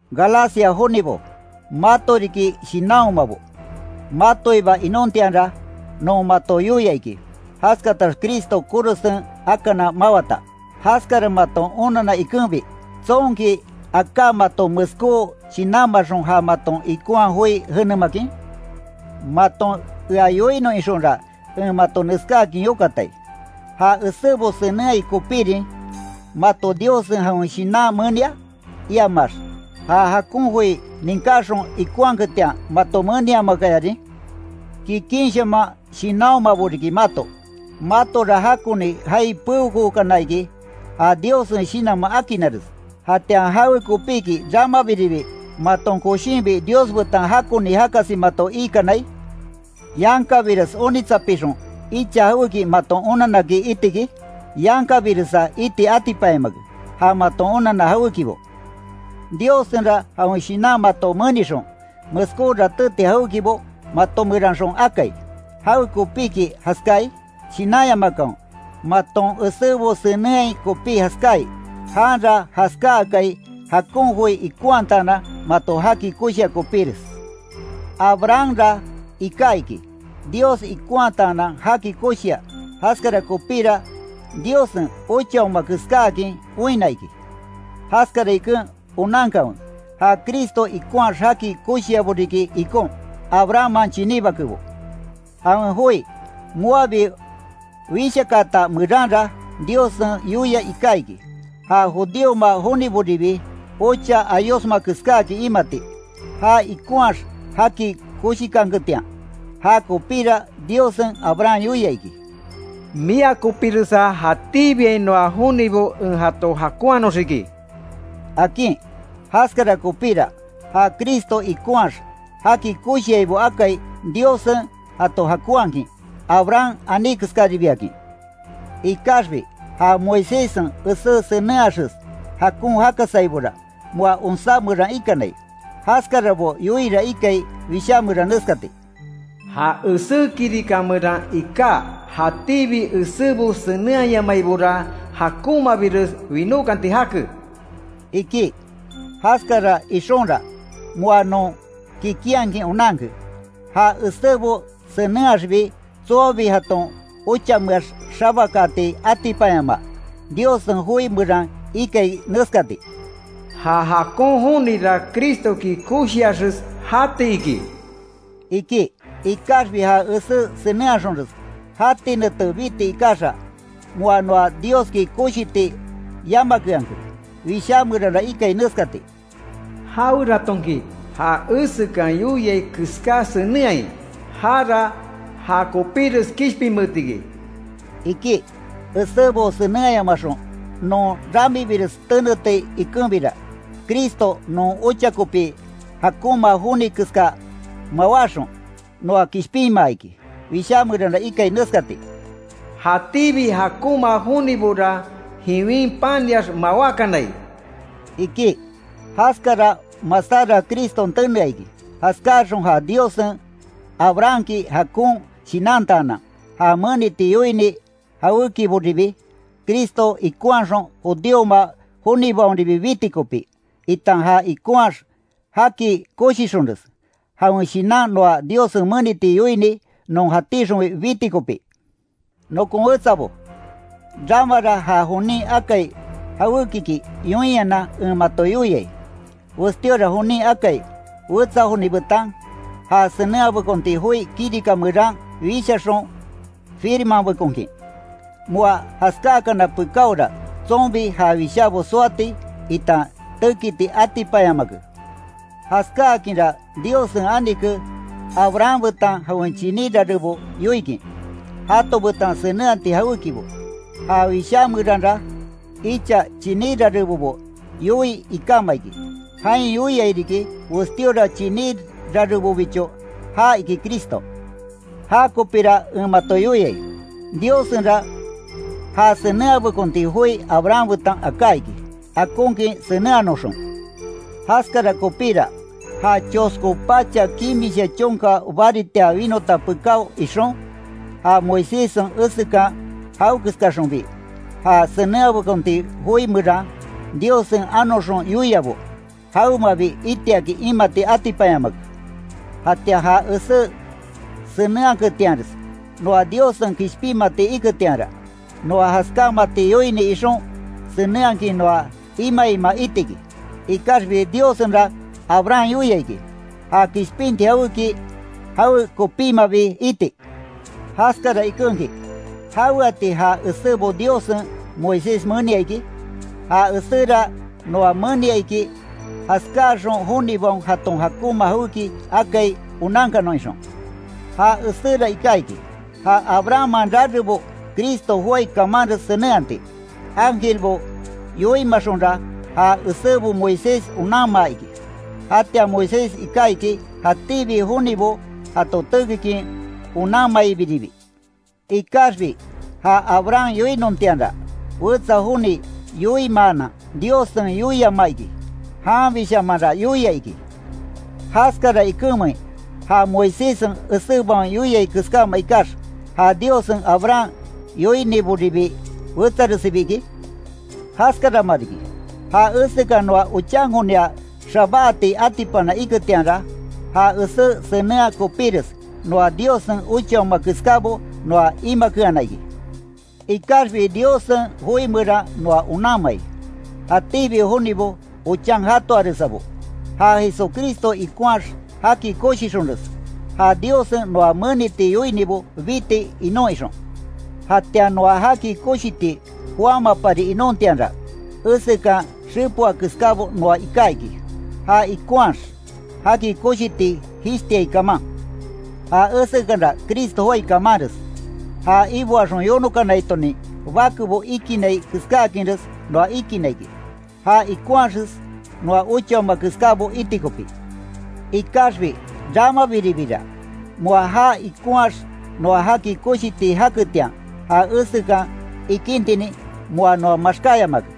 ¡Galacia jonibo, mato riki shinanhomabo! Matoiba inontianra, non mato yoia iki, jaskatax Cristo korosen akana mawata. Jaskara mato onanna ikenbi ¿Tsonki aká mato meskó shinanmaxon ja maton ikonhaa joi jenemakin? Maton ea yoinon ixonra, en mato neskáakin yokatai: ¿Ja esébo senenhai kopírin, mato Diossen jawen Shinan menia? iamax ¿Ja jakon joi ninkaxon ikonhaketian, mato meniamakayarin? Kikinshaman shinanhomabo riki mato. Matora jakoni jaai peokookana iki, ja Diossen Shinanman akinares. ¿Jatian jawekopiki, ramabiribi maton koshinbi Dios betan jakoni jakasi mato iikanai? ¿Yankabires onitsapixon, icha jawéki maton onanaki iti iki? ¡Yankabiresa iti atipanyamake, ja maton onanna jawékibo! Diossenra jawen Shinan mato menixon, meskó ratéti jawékibo mato meranxon akai. ¿Jawekopiki jaskáai? Shinanyamakanwe maton esébo senenhai kopí jaskáai. Janra jaskáakai, jakon joi ikonhataanan mato jaki koshia kopíres. Abrahamra iká iki, Dios ikonhataanan jaki koshia, jaskara kopíra, Diossen, Ochaoma keskáakin oinna iki. Jaskara iken onankanwe, ja Cristo ikonhaax jaki koshiabo riki ikon, Abrahamman chiní bakebo. Jawen joi, moabi Wishakaata meranra Diossen yoia iká iki, ja judíoma joniboribi ocha ayosma keskáakin imati, já ikonhaax jaki koshikanketian. Ja kopíra Diossen Abraham yoia iki: “Mia kopiresa jatíbiainoa jonibo en jato jakonhanoxiki”, akin. Jaskara kopíra, ja Cristo ikonhaax jaki koshiaibo akai, Diossen jato jakonhakin, Abraham aní keskaribiakin. Ikaxbi, ja Moiséssen esé senenhaaxes jakon jakasaibora, moa onsá meran ikanai. Jaskarabo yoiira ikai, Wishá meran neskati: “Ja esé kirika meran iká, jatíbi esébo senenhayamaibora jakonmabires winókanti jake”, iki. Jaskara ixonra, moa non kikinhakin onanke, ja esébo senenhaaxbi tsoabi jaton ochameax xabakaati atipanyamaa. Diossen joi meran ikai neskati: “Ja jakon jonira Cristoki koshiaxes jati iki”, iki. Ikaxbi ja esé senenhaxonres jati nete biti ikaxa, moa noa Dioski koshiti yamakeanke. Wishá meranra ikai neskati: “Jaweratonki ja esekan yoiai keská senenhai, jara ja kopíres kishpinmeetiki”, iki. Esébo senenhayamaxon non ramibires teneti ikenbira, Cristo non ocha kopi jakonma joni keska mawáxon, noa kishpinmaa iki. Wishá meranra ikai neskati: “jatíbi jakonma jonibora, jiwin paniax mawákanai”, iki. Jaskara masára Criston tenea iki, jaskáaxon ja Diossen Abrahamki jakon shinantaanan, ja meniti yoini jawékiboribi, Cristo ikonhaxon judíoma jonibaonribi biti kopí, itan ja ikonhaax jaki koshixonres, jawen Shinan noa Diossen meniti yoini non jatíxonbi biti kopí. Nokon wetsabo, ramara ja jonin akai jawékiki yoinhanan en mato yoiai: Westíora jonin akai, wetsa joni betan, ja senenhabekonti joi kirika meran wishaxon firmanbekonkin, moa jaskákana pekáora tsonbi ja wishábo soati, itan tekiti atipanyamake. Jaskáakinra Diossen anike Abraham betan jawen chiní rarebo yoikin, jato betan senenhati jawékibo. Ja Wishá meranra “icha chiní rarebobo”, yoii ikama iki. Jain yoiai riki: “Westíora chiní rarebobicho”, ja iki Cristo. Ja kopíra en mato yoiai: Diossenra ja senenhabekonti joi Abraham betan aká iki, akonkin senenhanoxon. Jaskara kopíra, ja chosko pacha kimisha chonka baritia winota pekáo ixon, ja Moiséssen esekan jawekeskaxonbi, ja senenhabekonti joi meran, Diossen anoxon yoiabo, jawemabi itiakin imati atipanyamake. Jatian ja esé senenhaketianres, noa Diossen kishpinmati iketianra, noa jaskámati yoini ixon senenhakin noa imaima itiki. Ikaxbi Diossenra Abraham yoia iki, ja kishpinti jawéki jawekopímabi iti. Jaskara ikenki, ¿Jaweati ja esébo Diossen Moisés menia iki? Ja eséra noa menia iki, jaskáaxon jonibaon jaton jakonma jawéki akai onankanon ixon. Ja eséra iká iki, ja Abrahamman rarebo Cristo joái kamanres senenhati. Ángelbo yoimaxonra, ja esébo Moisés onanma iki, jatian Moisés iká iki, jatíbi jonibo jato tekikin onanmaibiribi. Ikaxbi ja Abraham yoinontianra, wetsa joni yoimaanan Diossen yoiamaa iki, janbishamanra yoia iki. ¿Jaskara ikenmein, ja Moiséssen esébaon yoia keskáma ikax, ja Diossen Abraham yoiniboribi wetsaresibi iki? Jaskarama riki, ja esekan noa ochankonia xabáati atipana iketianra, ja esé senenhaa kopíres, noa Diossen ochaoma keskábo noa imakeana iki. Ikaxbi Diossen joi meran noa onanmai: Jatíbi jonibo ochan jatoaresabo, ja Jesucristo ikonhaax jaki koshixonres, ja Diossen noa meniti yoinibo biti inon ixon. Jatian noa jaki koshiti joámapari inontianra, esekan xepoa keskábo noa iká iki, ja ikonhaax, jaki koshiti jishtiai kaman. Ja esekanra Cristo joái kamanres, ja iboaxon yonokanaitonin bakebo ikinai keskáakinres noa ikinna iki, já ikonhaxes noa ochaoma keskábo iti kopí. Ikaxbi ramabiribira, moa ja ikonhaax noa jaki koshiti jaketian, ja esekan ikintinin moa noa maxkáyamake.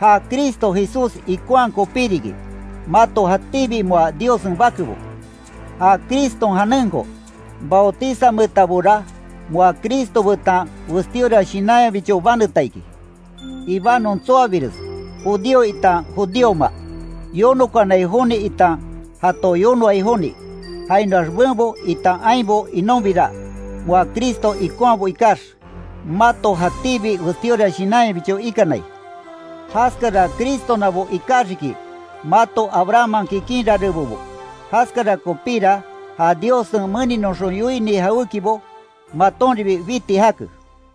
Ja Cristo Jesús ikonhaa kopí riki, mato jatíbi moa Diossen bakebo. Ja Criston janenko bautizanmeetabora, moa Cristo betan westíora shinanyabicho baneta iki. Ibanon tsoabires, judío itan judíoma; yonokanai joni itan jato yonoai joni; jainoax benbo itan ainbo inonbira, moa Cristo ikonhaabo ikax, mato jatíbi westíora shinanyabicho ikanai. Jaskara Cristonabo ikaxiki, mato Abrahamman kikin rarebobo, jaskara kopíra ja Diossen meninoxon yoini jawékibo, matonribi biti jake.